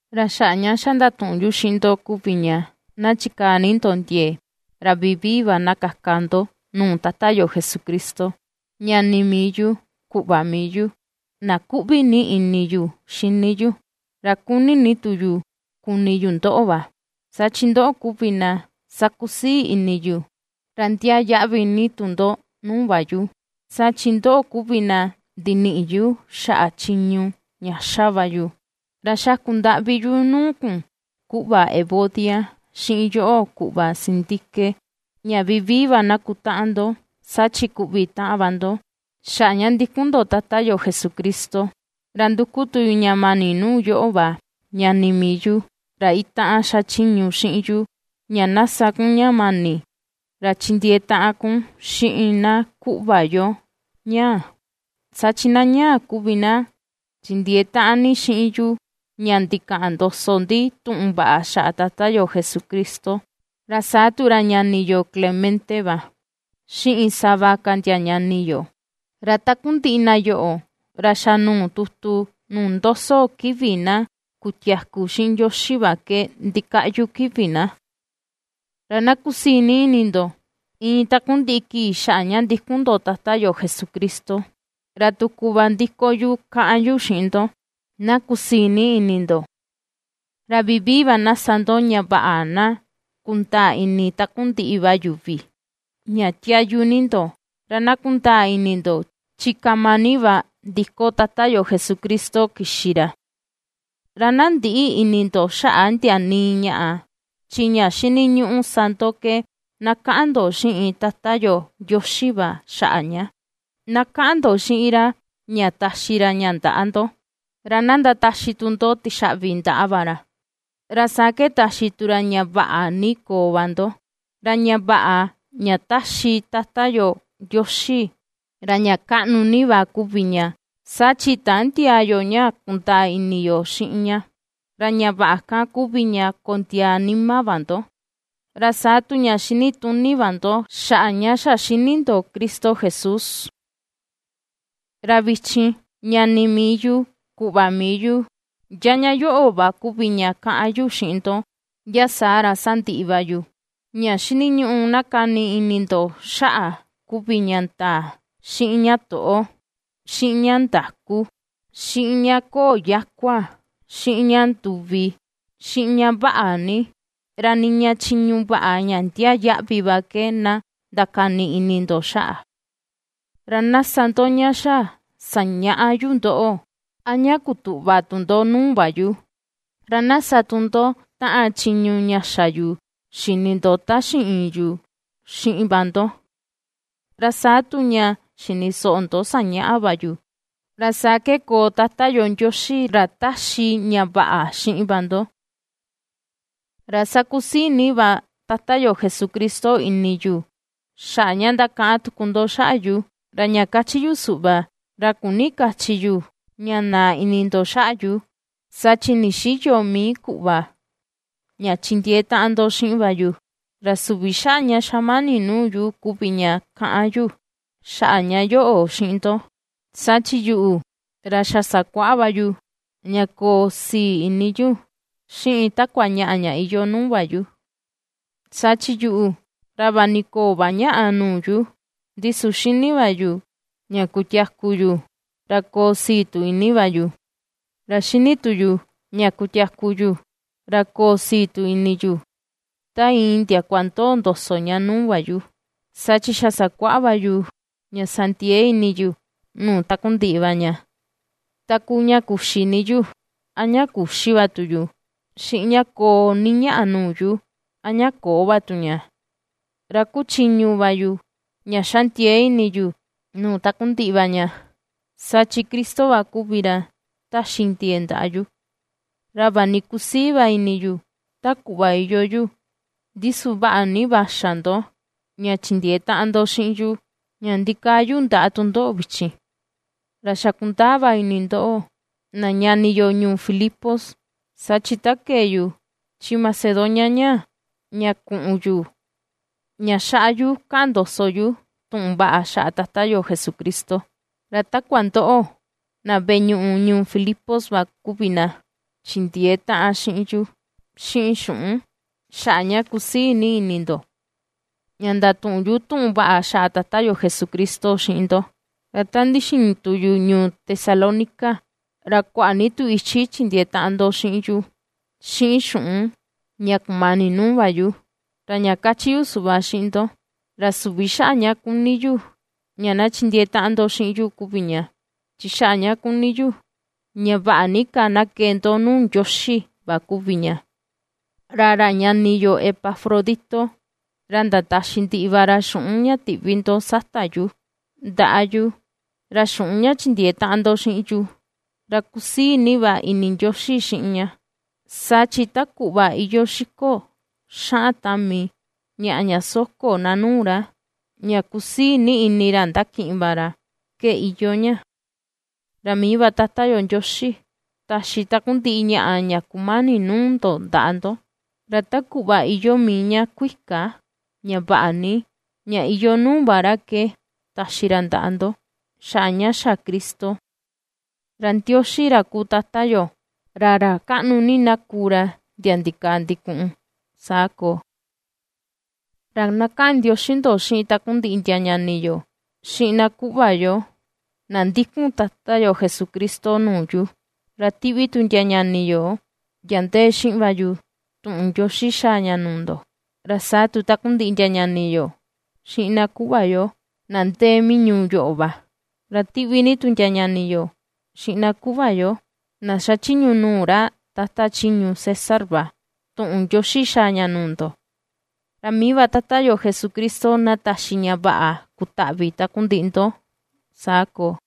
Ra xaꞌa ña xa ndatuꞌun yu xiꞌin ndo kuvi ña, na chikaa ni ndo ndiee, ra vivii va na kaka ndo nuu Tata yo Jesucristo, ñani mii yu, kuꞌva mii yu, na kuꞌvi ni ini yu xini yu, ra kuni ni tu yu kuni yu ndoꞌo va, saa chi ndoꞌo kuvi na sakusii ini yu, ra ndiaa yaꞌvi ni tu ndo nuu va yu, saa chi ndoꞌo kuvi na ndiniꞌi yu xaꞌa chiñu ña ^xa va yu. Ra xaku ndaꞌvi yu nuu kun kuꞌva Evodia xiꞌin yoꞌo kuꞌva Síntique, ña vivii va na kutaꞌan ndo, saa chi kuꞌvi taꞌan va ndo xaꞌa ña ndikun ndo Tata yo Jesucristo. Ra nduku tu yu ña mani nuu yoꞌo va ñani mii yu, ra itaꞌan xachiñu xiꞌin yu, ña na sa kun ña mani, ra chindiee taꞌan kun xiꞌin na kuꞌva yo ñaa, saa chi na ñaa kuvi na chindiee taꞌan ni xiꞌin yu ña ndikaꞌan ndoso ndi tuꞌun vaꞌa xaꞌa Tata yo Jesucristo, ra saa tu ra ñani yo Clemente va, xiꞌin sava ka ndia ñani yo. Ra takundiꞌi na yoꞌo, ra xa nuu tutu nuu ndoso kivi na kutiaku xiꞌin Ndioxi va ke ndikaꞌyu kivi na. Ra na kusii ni ini ndo, iin takundiꞌi kii xaꞌa ña ndikun ndo Tata yo Jesucristo. Ra tuku va ndiko yu kaꞌan yu xiꞌin ndo: ¡Na kusii ni ini ndo! Ra vivii va na sa ndo ña vaꞌa na kundaa ini takundiꞌi va yuvi, ña tiayu ni ndo. Ra na kundaa ini ndo, chi kama ni va ndiko Tata yo Jesucristo kixi ra. Ra na ndïꞌi ini ndo xaꞌa ndia nii ñaꞌa, chi ña xiniñuꞌu sa ndo ke na kaꞌan ndo xiꞌin Tata yo Ndioxi va xaꞌa ña; na kaꞌan ndo xiꞌin ra ña taxi ra ña ndaꞌa ndo, ra na ndataxi tu ndo tixaꞌvi ndaꞌa va ra. Ra saa ke taxi tu ra ña vaꞌa ni koo va ndo, ra ña vaꞌa ña ^taxi Tata yo Ndioxi, ra ña kaꞌnu ni va kuvi ña, saa chi tändiaa yo ña kundaa ini yo xiꞌin ña, ra ña vaꞌa kan kuvi ña kondiaa nima va ndo, ra saa tu ña xinituni va ndo xaꞌa ña xa xini ndo Cristo Jesús. Ra vichin, ñani mii yu, kuꞌva mii yu, ndia ña yoꞌo va kuvi ña kaꞌan yu xiꞌin ndo, ndia saa ra sandiꞌi va yu: ña xiniñuꞌu na kani ini ndo xaꞌa kuvi ña ndaa, xiꞌin ña toꞌo, xiꞌin ña ndakú, xiꞌin ña köo yakua, xiꞌin ña nduvi, xiꞌin ña vaꞌa ni. Ra niña chiñu vaꞌa ña ndiaa yaꞌvi va ke na ndakani ini ndo xaꞌa. Ra na sa ndo ña xa sañaꞌa yu ndoꞌo, a ña kutuꞌva tu ndo nuu va yu; ra na sa tu ndo taꞌan chiñu ña xa yu xini ndo ta ndixiin yu xiꞌin va ndo: ra saa tu ña xini soꞌo ndo sañaꞌa va yu, ra saa ke koo Tata yo Ndioxi, ra ^taxi ña vaꞌa xiꞌin va ndo. Ra ^sakusii ni va Tata yo Jesucristo ini yu xaꞌa ña ^ndakaꞌan tuku ndo xaꞌa yu. Ra ña kachi yu suꞌva, ra küni kachi yu ña naa ini ndo xaꞌa yu, saa chi ndixïyo mii kuꞌva, ña chindiee taꞌan ndo xiꞌin va yu. Ra süvi xaꞌa ña xamani nuu yu kuvi ña ^kaꞌan yu xaꞌa ña yoꞌo xiꞌin ndo, saa chi yuꞌu, ra xa sakuaꞌa va yu, ña koo sii ini yu xiꞌin takua ñaꞌa ña iyoo nuu va yu. Saa chi yuꞌu, ra vaꞌa ni köo va ñaꞌa nuu yu, ndi su xini va yu ña kutiaku yu, ra koo sii tu ini va yu; ra xini tu yu ña kutiaku yu, ra koo sii tu ini yu, ta iin ndiakua ndoo ndoso ña nuu va yu. Saa chi xa sakuaꞌa va yu ña sa ndiee ini yu nuu takundiꞌi va ña, ta kuu ña kuxi ni yu, a ña küxi va tu yu, xiꞌin ña koo ni ñaꞌa nuu yu, a ña köo vaꞌa va tu ña. Ra ^kuchiñu va yu, ña ^xa ndiee ini yu nuu takundiꞌi va ña, saa chi Cristo va kuvi ra ^taxi ndiee ndaꞌa yu. Ra vaꞌa ni ^kusii va ini yu ta kuꞌva iyoo yu, ndi su vaꞌa ni va xa ndo, ña chindiee taꞌan ndo xiꞌin yu, ña ndikaa yu ndaꞌa tundoꞌo vichin. Ra xa kundaa va ini ndoꞌo, na ñani yo ñuu Filipos, saa chi ta kee yu chi Macedonia ñaa, ña kuꞌun yu, ña xaꞌa yu kaꞌan ndoso yu tuꞌun vaꞌa xaꞌa Tata yo Jesucristo, ra takua ndoꞌo, na veꞌe ñuꞌu ñuu Filipos va kuvi na chindiee taꞌan xiꞌin yu, xiꞌin xuꞌun, xaꞌa ña kusii ni ini ndo, ña ndatuꞌun yu tuꞌun vaꞌa xaꞌa Tata yo Jesucristo xiꞌin ndo. Ra ta ndixiin tu yu ñuu Tesalónica, ra kuaꞌa ni tu ichi chindiee taꞌan ndo xiꞌin yu, xiꞌin xuꞌun, ña kumani nuu va yu. Ra ña kachi yu suꞌva xiꞌin ndo, ra süvi xaꞌa ña kuni yu ña na chindiee taꞌan ndo xiꞌin yu kuvi ña; chi xaꞌa ña kuni yu ña vaꞌa ni ka na kee ndo nuu Ndioxi va kuvi ña. Ra ra ñani yo Epafrodito, ra ndataxi ndiꞌi va ra xuꞌun ña tiꞌvi ndo sata yu, ndaꞌa yu, ra xuꞌun ña chindiee taꞌan ndo xiꞌin yu, ra kusii ni ini Ndioxi xiꞌin ña, saa chi ta kuꞌva iyoo xiko xaꞌan tami ñaꞌa ña soko na nuu ra, ña kusii ni ini ra ndakiꞌin va ra, ke iyoo ña. Ra mii va Tata yu Ndioxi, taxi takundiꞌi ñaꞌa ña kumani nuu ndo ndaꞌa ndo, ra ta kuꞌva iyoo mii ña kuika, ña vaꞌa ni, ña iyoo nuu va ra ke taxi ra ndaꞌa ndo, xaꞌa ña xa Cristo. ¡Ra Ndioxi ra kuu Tata yo, ra ra kaꞌnu ni na kuu ra ndia ndikaa ndikuꞌun! Saa koo. Ra na kaꞌan ndioxi ndo xiꞌin takundiꞌi ndia ñani yo, xiꞌin na kuꞌva yo na ndikun Tata yo Jesucristo nuu yu. Ra tiꞌvi tu ndia ñani yo ndia ndee xiꞌin va yu, tuꞌun ndioxi xaa ña nuu ndo. Ra saa tu takundiꞌi ndia ñani yo, xiꞌin na kuꞌva yo, na ndee mii ñuu yoꞌo va; ra ^tiꞌvi ni tu ndia ñani yo, xiꞌin na kuꞌva yo, na xachiñu nuu ra tata chiñu César va tuꞌun ndioxi xaa ña nuu ndo. Ra mii va Tata yo Jesucristo na taxi ña vaꞌa kutaꞌvi takundiꞌi ndo. Saa koo.